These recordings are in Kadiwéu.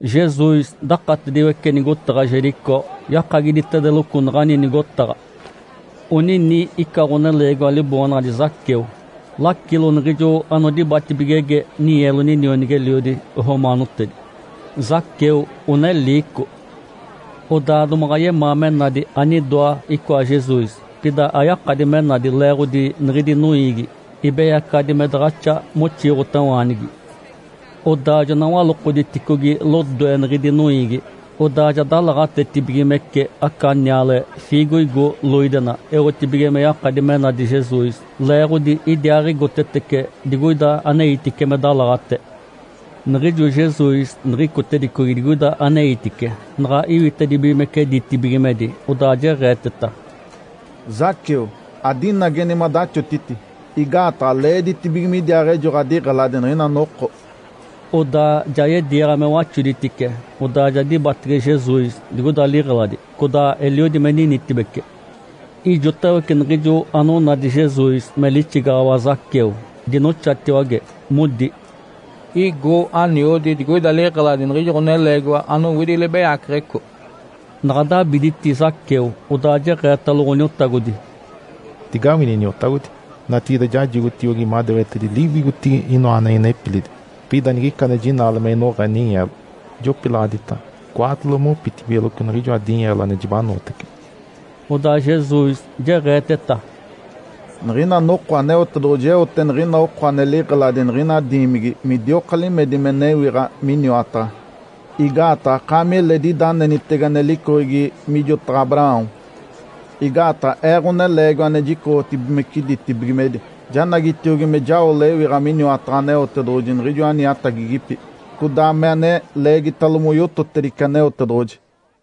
Jesus dakatediwece nigotaɡ̶a Jericó, yakagiditedeloco naɡ̶ani nigotaɡ̶a. Onini ica ɡ̶oneleegiwa liboonaɡ̶adi Zaqueu, lacilo niɡ̶ijo anodibatibigege ninyeelo ninionigi-eliodi romaanotedi. Zaqueu one liico. Odaa domaɡ̶a yemaa me nadi anidoa icoa Jesus, pida ayakadi me nadi leeɡ̶odi niɡ̶idi noiigi, ibeyacaɡ̶adi me daɡ̶axa moxiiɡ̶otawaanigi. Odaa jona walokoditicogi lodoe niɡ̶idi noiigi, odaa ja dalaɡ̶atetibigimece aca niale, fiigoigo loidena, eotibige me yakadi me nadi Jesus, leeɡ̶odi idiaaɡ̶igotetece digoida aneitice me dalaɡ̶ate. Niɡ̶ijo Jesus niɡ̶icotedicogi digoida aneitice, naɡ̶a iwitedibigimece ditibigimedi, odaa jeɡ̶eeteta, “Zaqueu, adinageni madaxotiti, igaataɡ̶a leeditibige midiaaɡ̶ejo ɡ̶adiɡ̶eladi niɡ̶ina noko.” Odaa ja yediiɡ̶a me waxoditice, odaa ja dibatege Jesus digoida liɡ̶eladi, codaa eliodi me ninitibece. Ijotawece niɡ̶ijo anonadi Jesus me lixigaɡ̶awa Zaqueu, dinoxatiwage, modi, “Igo aniodi digoida liɡ̶eladi niɡ̶ijo ɡ̶oneleegiwa anowidi libeyaceɡ̶eco.” Naɡ̶a dabiditi Zaqueu, odaa jeɡ̶eetalo Ǥoniotagodi, “Digawini, Iniotagodi! Natigide jajigotiogi madewetedi liwigotigi inoa ane inepilidi. Pida nigica ane jinaale me inoɡ̶a ninyeelo, jopilaɡ̶aditace cwaatolo mopitibigeloco niɡ̶ijoa dinyeelo ane jibanootece.” Odaa Jesus jeɡ̶eeteta, “Niɡ̶ina noko Aneotedoɡ̶oji eote niɡ̶ina oko ane liɡ̶eladi niɡ̶ina diimigi midioka limedi me newiɡ̶a miniwataɡ̶a. Igaataɡ̶a akaami eledi ida anenitege ane licoɡ̶egi mijotaɡ̶a Abraão. Igaataɡ̶a Ee, Ǥoneleegiwa ane jicoɡ̶otibigimece ditibigimedi, janagitiogi me jao lewiɡ̶a miniwataɡ̶a Aneotedoɡ̶oji niɡ̶ijo aniatagigipi, codaa me ane leegitalo moyototedice Aneotedoɡ̶oji.”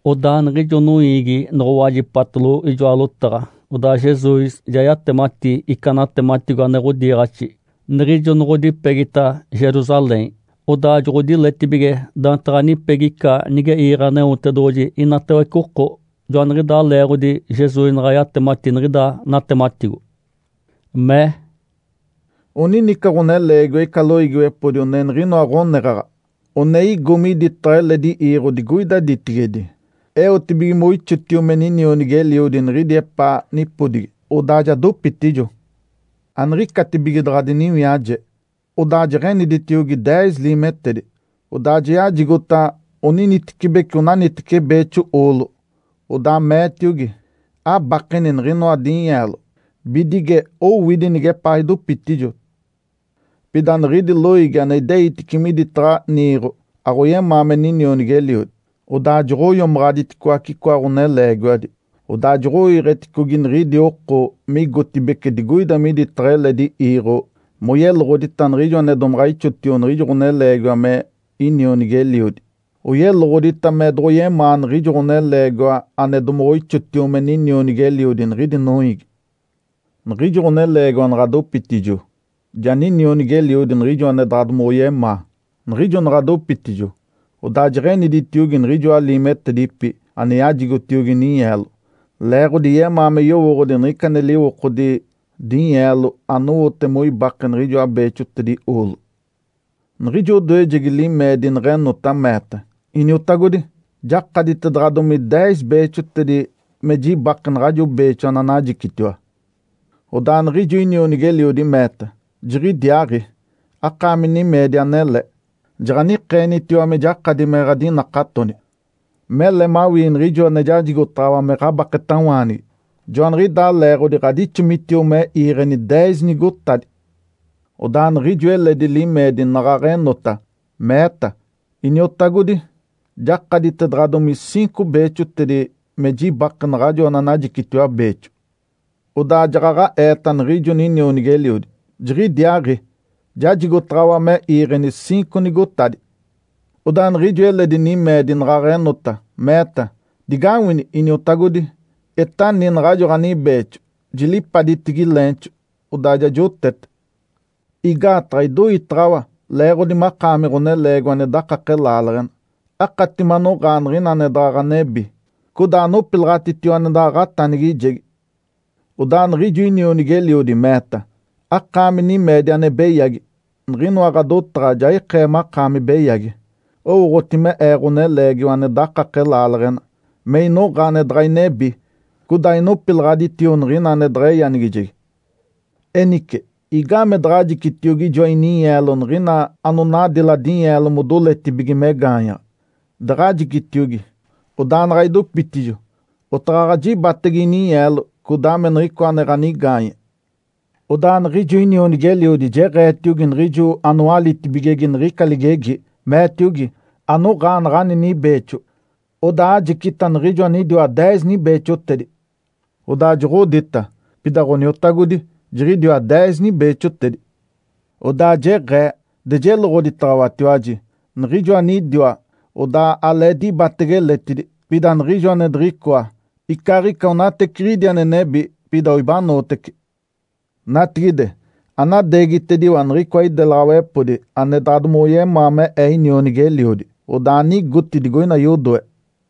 Odaa niɡ̶ijo noiigi noɡ̶owajipatalo ijoa lotaɡ̶a, odaa Jesus ja yatemati ica natematigo ane ɡ̶odiiɡ̶axi. Niɡ̶ijo noɡ̶odipegita Jerusalém, odaa joɡ̶odiletibige daantaɡ̶a nipegi ica nige iiɡ̶e Aneotedoɡ̶oji inatawece oko. Joaniɡ̶idaa leeɡ̶odi Jesus naɡ̶a yatemati niɡ̶ida natematigo. Mee, “Onini ica ɡ̶oneleegiwa ica loiigiwepodi one niɡ̶inoa ɡ̶oneɡ̶aɡ̶a. One igo miditaɡ̶a eledi iiɡ̶o digoida ditigedi, eotibige moixotio me ninionigi-eliodi niɡ̶idi epaa nipodigi. Odaa ja dopitijo. Aniɡ̶icatibige daɡ̶a diniwiaje, odaa jeɡ̶eniditiogi deez liimetedi. Odaa yajigota oninitecibeci onaniteci beexo oolo, odaa meetiogi, ‘Abakeni niɡ̶inoa dinyeelo bidige owidi nigepaa idopitijo.’ Pida niɡ̶idi loiigi ane ideitice miditaɡ̶a niiɡ̶o aɡ̶oyemaa me ninionigi-eliodi. Odaa joɡ̶oiomaɡ̶aditicoace icoa ɡ̶oneleegiwadi, odaa joɡ̶oiiɡ̶eticogi niɡ̶idi oko me igotibeci digoida miditaɡ̶a eledi iiɡ̶o moyeloɡ̶odita niɡ̶ijo ane domaɡ̶a ixotio niɡ̶ijo ɡ̶oneleegiwa me inionigi-eliodi. Oyeloɡ̶odita me doɡ̶oyemaa niɡ̶ijo ɡ̶oneleegiwa ane domaɡ̶a ixotio me ninionigi-eliodi niɡ̶idi noiigi. Niɡ̶ijo ɡ̶oneleegiwa naɡ̶a dopitijo, ja ninionigi-eliodi niɡ̶ijo ane daɡ̶a domoɡ̶oyemaa. Niɡ̶ijo naɡ̶a dopitijo, odaa jeɡ̶eniditiogi niɡ̶ijoa liimetedipi ane yajigotiogi ninyeelo, leeɡ̶odi yemaa me yowooɡ̶odi niɡ̶ica ane liwokodi dinyeelo anowote moibake niɡ̶ijoa beexotedi oolo. Niɡ̶ijo odoejegi limeedi neɡ̶enota, meeta, ‘Iniotagodi, jakaditedaɡ̶adomi deez beexotedi me jibake naɡ̶ajo beexo ananajicitiwa.’ Odaa niɡ̶ijo inionigi-eliodi meeta, ‘Jiɡ̶idiaaɡ̶i! Akaami nimeedi anele! Jaɡ̶anikeenitiwa me jakadi me ɡ̶adinakatoni, mele mawii niɡ̶ijo ane jajigotaɡ̶awa me ɡ̶abaketawaanigi. Joaniɡ̶idaa leeɡ̶odi ɡ̶adixomitio me iiɡ̶eni deez nigotadi.’ Odaa niɡ̶ijo eledi limeedi naɡ̶aɡ̶a enota, meeta, ‘Iniotagodi, jakaditedaɡ̶adomi ciinco beexotedi me jibake naɡ̶ajo ananajicitiwa beexo.’ Odaa jaɡ̶aɡ̶a eeta niɡ̶ijo ninionigi-eliodi, ‘Jiɡ̶idiaaɡ̶i! Jajigotaɡ̶awa me iiɡ̶eni ciinco nigotadi.’ Odaa niɡ̶ijo eledi nimeedi naɡ̶aɡ̶a enota, meeta, ‘Digawini, Iniotagodi! Etani naɡ̶ajo ɡ̶anibeexo. Jilipaditigi leenxo, odaa ja jotete. Igaataɡ̶a idoitaɡ̶awa, leeɡ̶odi makaami ɡ̶oneleegiwa ane dakake laaleɡ̶ena. Akati manoɡ̶aa niɡ̶ina ane daɡ̶a ɡ̶anebi, codaa anopilaɡ̶atitio ane daɡ̶a ɡ̶atanigijegi.’ Odaa niɡ̶ijo inionigi-eliodi meeta, ‘Akaami nimeedi ane beyagi! Niɡ̶inoa ɡ̶adotaɡ̶a ja ikee makaami beyagi. Owooɡ̶oti me ee ɡ̶oneleegiwa ane dakake laaleɡ̶ena, me inoɡ̶a ane daɡ̶a inebi, codaa inopilaɡ̶aditio niɡ̶ina ane daɡ̶a eyanigijegi. Enice, igaamee daɡ̶ajicitiogi ijoa ininyeelo niɡ̶ina anonadila dinyeelo modoletibige me gaanyaɡ̶a? Daɡ̶ajicitiogi, odaa naɡ̶a idopitijo, otaɡ̶aɡ̶a jibatacege ininyeelo codaa me niɡ̶icoa ane ɡ̶anigaanye.’ Odaa niɡ̶ijo inionigi-eliodi jeɡ̶eetiogi niɡ̶ijo anowalitibigege niɡ̶ica ligegi, meetiogi, ‘Anoɡ̶aa naɡ̶ani nibeexo, odaa ajicitiogi niɡ̶ijo anidiwa deez nibeexotedi.’ Odaa joɡ̶odita, ‘Pida Ǥoniotagodi, jiɡ̶idiwa deez nibeexotedi.’ Odaa jeɡ̶ee, ‘De jeloɡ̶oditaɡ̶awatiwaji, niɡ̶ijo anidiwa, odaa alee dibatege eletidi. Pida niɡ̶ijo ane diɡ̶icoa, icaaɡ̶ica onateciɡ̶idi ane nebi pida oibanootece. Natigide, anadeegitediwa niɡ̶icoa idelaɡ̶awepodi ane daɡ̶a domoɡ̶oyemaa me ee ninionigi-eliodi, odaa anigoti digoina yodoe.’”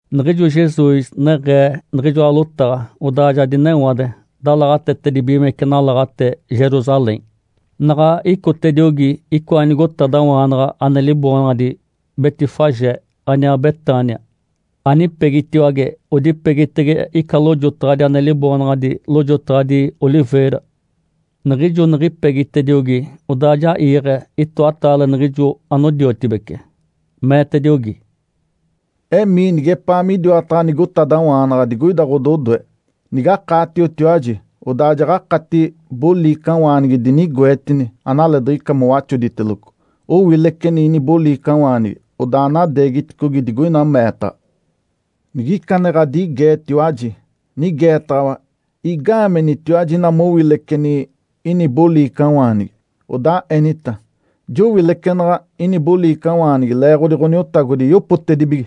Niɡ̶ijo Jesus neɡ̶ee niɡ̶ijoa lotaɡ̶a, odaa ja dinewade, dalaɡ̶atetedibigimece nalaɡ̶ate Jerusalém. Naɡ̶a icotediogi icoa nigotadawaanaɡ̶a ane liboonaɡ̶adi Betfagé, aniaa Betânia, anipegitiwage odipegitege ica lojotaɡ̶adi ane liboonaɡ̶adi “Lojotaɡ̶adi Oliveira”. Niɡ̶ijo niɡ̶ipegitediogi, odaa ja iiɡ̶e itoataale niɡ̶ijo anodiotibece. Meetediogi, “Emii nigepaa midiwataɡ̶a nigotadawaanaɡ̶a digoida ɡ̶ododoe. Nigakaatiotiwaji, odaa jaɡ̶akati boliicawaanigi dinigoetini, analeediɡ̶ica mowaxoditeloco. Owileceni ini boliicawaanigi, odaa anadeegiticogi digoina meetaɡ̶a. Nigica ane ɡ̶adigeetiwaji, nigeetaɡ̶awa, ‘Igaamenitiwaji ina mowileceni ini boliicawaanigi?’ Odaa enita, ‘Jowilecenaɡ̶a ini boliicawaanigi leeɡ̶odi Ǥoniotagodi yopotedibige.’”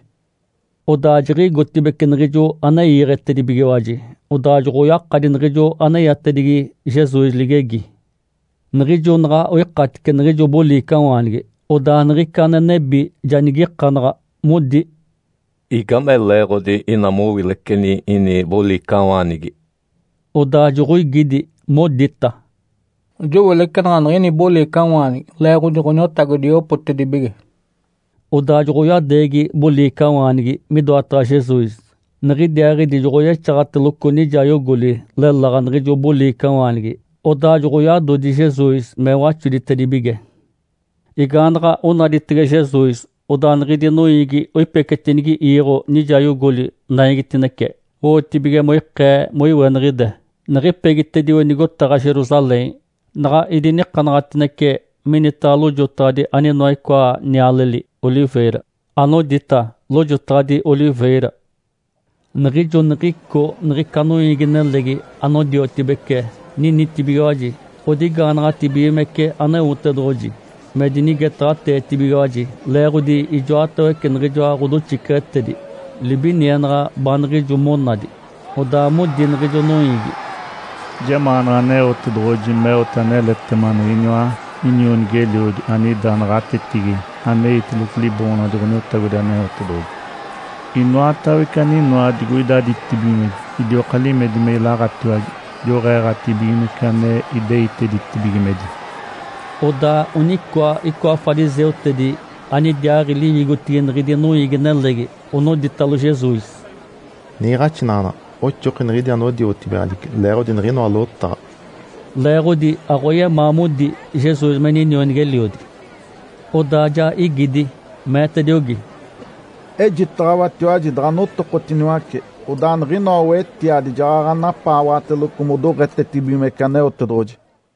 Odaa jiɡ̶igotibeci niɡ̶ijo ane iiɡ̶etedibigiwaji, odaa joɡ̶oyakadi niɡ̶ijo aneyatedigi Jesus ligegi. Niɡ̶ijo naɡ̶a oikatice niɡ̶ijo boliicawaanigi, odaa niɡ̶ica ane nebi ja nigikanaɡ̶a, modi, “Igame leeɡ̶odi ina mowileceni ini boliicawaanigi?” Odaa joɡ̶oigidi, modita, “Jowilecenaɡ̶a niɡ̶ini boliicawaanigi leeɡ̶odi Ǥoniotagodi yopotedibige.” Odaa joɡ̶oyadeegi boliicawaanigi midoataɡ̶a Jesus, niɡ̶idiaaɡ̶idi joɡ̶oyexaɡ̶ateloco nijayogoli leláɡ̶a niɡ̶ijo boliicawaanigi. Odaa joɡ̶oyadodi Jesus me waxoditedibige. Igaanaɡ̶a onaditege Jesus, odaa niɡ̶idi noiigi oipecetinigi iiɡ̶o nijayogoli naigitinece, owotibige moikee moiweniɡ̶ide. Niɡ̶ipegitedio nigotaɡ̶a Jerusalém, naɡ̶a idinikanaɡ̶atinece minitaɡ̶a lojotaɡ̶adi aninoa icoa nialeli “oliveira”, anodita “Lojotaɡ̶adi Oliveira”. Niɡ̶ijo niɡ̶ico niɡ̶ica noiigi-nelegi anodiotibece ninitibigiwaji, odigaanaɡ̶atibigimece Aneotedoɡ̶oji me dinigetaɡ̶ateetibigiwaji leeɡ̶odi ijoatawece niɡ̶ijoa ɡ̶odoxiceɡ̶etedi libinienaɡ̶a baaniɡ̶ijo monadi. Odaa modi niɡ̶ijo noiigi, “Jemaanaɡ̶a Aneotedoɡ̶oji meote aneletema niɡ̶iniwa inionigi-eliodi anida naɡ̶atetigi aneitelogo Liboonaɡ̶adi Ǥoniotagodi Aneotedoɡ̶oji. Inoatawece aninoa digoida ditibigimedi idioka limedi me ilaɡ̶atiwage. Joɡ̶eeɡ̶atibigimece ane ideitedice ditibigimedi.” Odaa onicoa icoa fariseutedi, anidiaaɡ̶i liwigotigi niɡ̶idi noiigi-nelegi, onoditalo Jesus, “Niiɡ̶axinaɡ̶anaɡ̶a! Oxoki niɡ̶idi anodiotibigaɡ̶adici leeɡ̶odi niɡ̶inoa lotaɡ̶a.” (Leeɡ̶odi aɡ̶oyemaa modi Jesus me inionigi-eliodi.) Odaa ja igidi, meetediogi, “Ejitaɡ̶awatiwaji daɡ̶a notokotiniwace, odaa niɡ̶inoa wetiadi jaɡ̶aɡ̶a napaawaɡ̶ateloco modoɡ̶etetibigimece Aneotedoɡ̶oji!”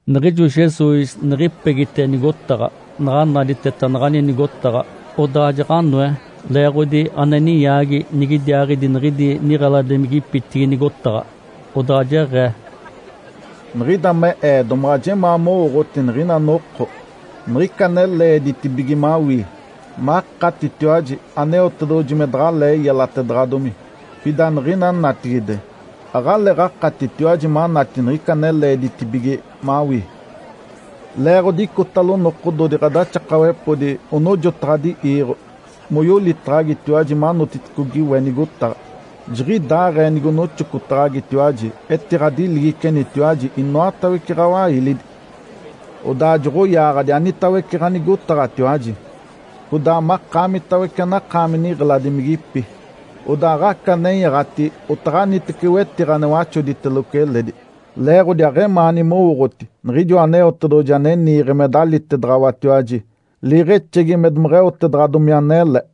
Niɡ̶ijo Jesus niɡ̶ipegite nigotaɡ̶a, naɡ̶a naditeta naɡ̶ani nigotaɡ̶a, odaa jaɡ̶anoe leeɡ̶odi ane ninyaagi nigidiaaɡ̶idi niɡ̶idi niɡ̶eladimigipitigi nigotaɡ̶a. Odaa jeɡ̶ee, “Niɡ̶ida me Ee domaɡ̶a jemaa mowooɡ̶oti niɡ̶ina noko niɡ̶ica ane leeditibige mawii makatitiwaji Aneotedoɡ̶oji me daɡ̶alee yelatedaɡ̶adomi. Pida niɡ̶ina natigide aɡ̶aleeɡ̶akatitiwaji manati niɡ̶ica ane leeditibige mawii. Leeɡ̶odi icotalo nokododi ɡ̶adaxakawepodi onojotaɡ̶adi iiɡ̶o moyolitaɡ̶agitiwaji manotiticogi we nigotaɡ̶a. Jiɡ̶idaaɡ̶ee nigonoxocotaɡ̶agitiwaji, etiɡ̶adiligicenitiwaji inoatawece ɡ̶awailidi. Odaa joɡ̶oyaaɡ̶adi anitawece ɡ̶anigotaɡ̶atiwaji, codaa makaamitawece anakaami niɡ̶eladimigipi. Odaa aɡ̶aca nenyaɡ̶ati otaɡ̶anitece wetiɡ̶a ane waxoditeloco eledi, leeɡ̶odi aɡ̶emaani mowooɡ̶oti Niɡ̶ijoa Aneotedoɡ̶oji ane niiɡ̶e me dalitaɡ̶awatiwaji Liiɡ̶exegi me domeɡ̶eotedaɡ̶adomi anele.”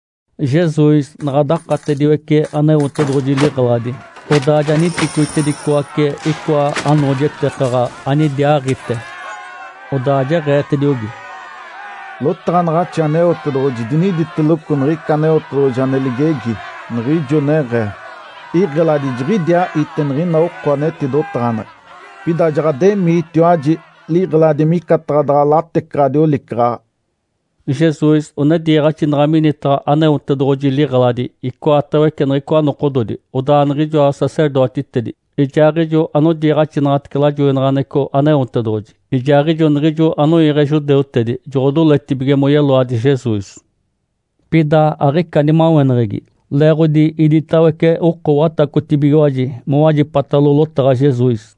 Jesus naɡ̶a dakatediwece Aneotedoɡ̶oji liɡ̶eladi, odaa ja niticoitedicoace icoa anoojetekaɡ̶a anidiaaɡ̶ite. Odaa jeɡ̶eetediogi, “Lotaɡ̶anaɡ̶axi Aneotedoɡ̶oji diniditeloco niɡ̶ica Aneotedoɡ̶oji ane ligegi, niɡ̶ijo neɡ̶ee, ‘Iɡ̶eladi jiɡ̶idiaa ite niɡ̶ina oko ane etidotaɡ̶aneɡ̶e.’ Pida jaɡ̶ademiitiwaji liɡ̶eladi micataɡ̶a daɡ̶a latecaɡ̶adi olicaɡ̶aɡ̶a.” Jesus one diiɡ̶axinaɡ̶a minitaɡ̶a Aneotedoɡ̶oji liɡ̶eladi icoatawece niɡ̶icoa nokododi. Odaa niɡ̶ijoa sacerdotitedi ijaaɡ̶ijo anodiiɡ̶axinaɡ̶atece lajoinaɡ̶aneɡ̶eco Aneotedoɡ̶oji, ijaaɡ̶ijo niɡ̶ijo anoiiɡ̶e judeutedi, joɡ̶odoletibige moyeloadi Jesus. Pida aɡ̶ica nimaweneɡ̶egi, leeɡ̶odi iditawece oko watacotibigiwaji, mowajipatalo lotaɡ̶a Jesus.